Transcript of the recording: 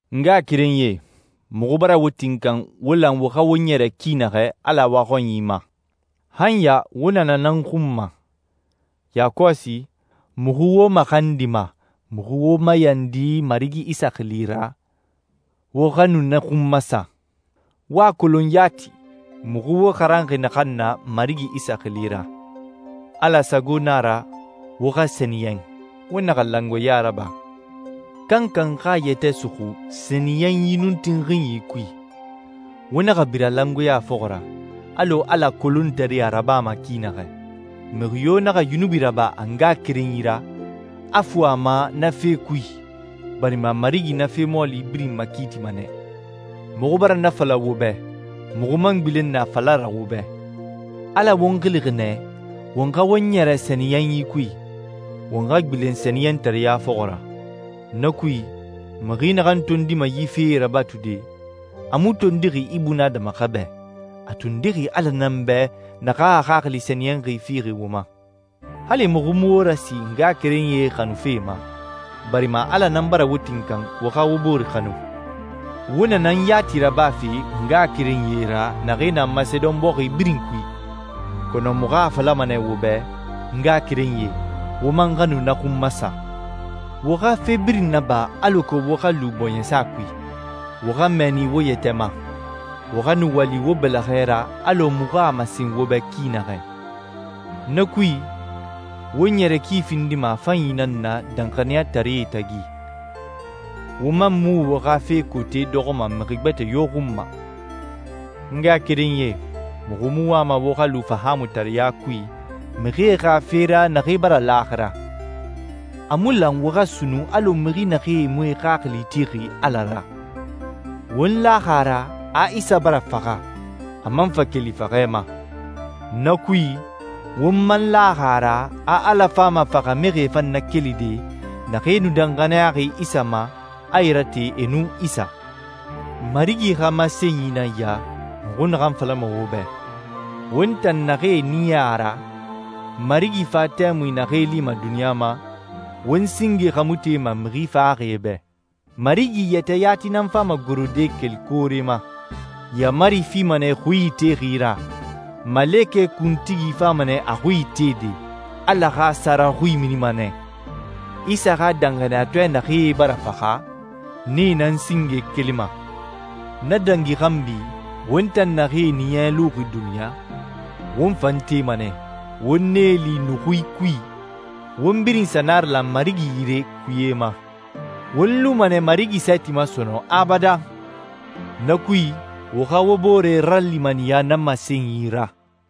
N ngaxakerenyie, muxu bara wo tinkan wo lan wo xa wo ɲɛrɛ ki naxɛ Ala waxɔnyi ma. Han ya wo na na nan xun ma. Yakɔsi, muxu wo maxandima, muxu wo mayandi Marigi Isa xili ra, wo xa nu na xun masa. Wo a kolon yati muxu wo xaranxi naxan na Marigi Isa xili ra. Ala sago na a ra wo xa sɛniyɛn. Wo naxa langoeɲa raba. Kankan xa a yɛtɛ suxu sɛniyɛnyi nun tinxinyi kui. Wo naxa bira langoeɲa fɔxɔ ra, alɔ Ala kolontaree a rabama ki naxɛ. Mixi yo naxa yunubi raba a ngaxakerenyi ra, a fu a ma na fe kui, barima Marigi na fe mɔɔli birin makiitima nɛ. Muxu bara na fala wo bɛ, muxu man gbilen nɛ a fala ra wo bɛ. Ala won xilixi nɛ won xa won ɲɛrɛ sɛniyɛnyi kui, won xa gbilen sɛniyɛntareɲa fɔxɔ ra. Na kui, mixi naxan tondima yi fee rabatude, a mu tondixi ibunadama xa bɛ, a tondixi Ala nan bɛ naxan a Xaxili Sɛniyɛnxi fixi wo ma. Hali muxu mu wo rasi ngaxakerenyie xanufe ma, barima Ala nan bara wo tinkan wo xa wo bore xanu. Wo na nan yati rabafe ngaxakerenyie ra naxee na Masedon bɔxi birin kui. Kɔnɔ muxu a falama nɛ wo bɛ, n ngaxakerenyie, wo man xa nu na xun masa. Wo xa fe birin naba alako wo xa lu bɔɲɛsa kui. Wo xa mɛɛni wo yɛtɛ ma. Wo xa nu wali wo bɛlɛxɛ ra alɔ muxu a masen wo bɛ ki naxɛ. Na kui, wo ɲɛrɛ ki findima a fanyi nan na danxaniyataree tagi, wo man mu wo xa fe kote dɔxɔma mixi gbɛtɛ yo xun ma. N ngaxakerenyie, muxu mu wama wo xa lu fahaamutareɲa kui mixie xa fe ra naxee bara laaxira. A mu lan wo xa sunnun alɔ mixi naxee mu e xaxili tixi Ala ra. Won laxi a ra a Isa bara faxa, a man fa keli faxɛ ma. Na kui, won man laxi a ra a Ala fama faxamixie fan nakelide naxee nu danxaniyaxi Isa ma, a e rate e nun Isa. Marigi xa masenyi nan ya, muxu naxan falama wo bɛ: Won tan naxee ɲiɲɛ a ra, Marigi fa tɛmui naxee lima duniɲa ma, won singe xa mu tema mixi faxaxie bɛ. Marigi yɛtɛ yati nan fama gorode keli koore ma. Yaamari fima nɛ xui itexi ra. Malekɛ kuntigi fama nɛ a xui itede. Ala xa sara xui minima nɛ. Isa xa danxaniyatɔɛ naxee bara faxa, nee nan singe kelima. Na dangi xanbi, won tan naxee ɲiɲɛ luxi duniɲa, won fan tema nɛ, won nee li nuxui kui, won birin sa naralan Marigi yire kuye ma. Won luma nɛ Marigi sɛɛti ma sɔnɔn abadan. Na kui, wo xa wo bore ralimaniya na masenyi ra.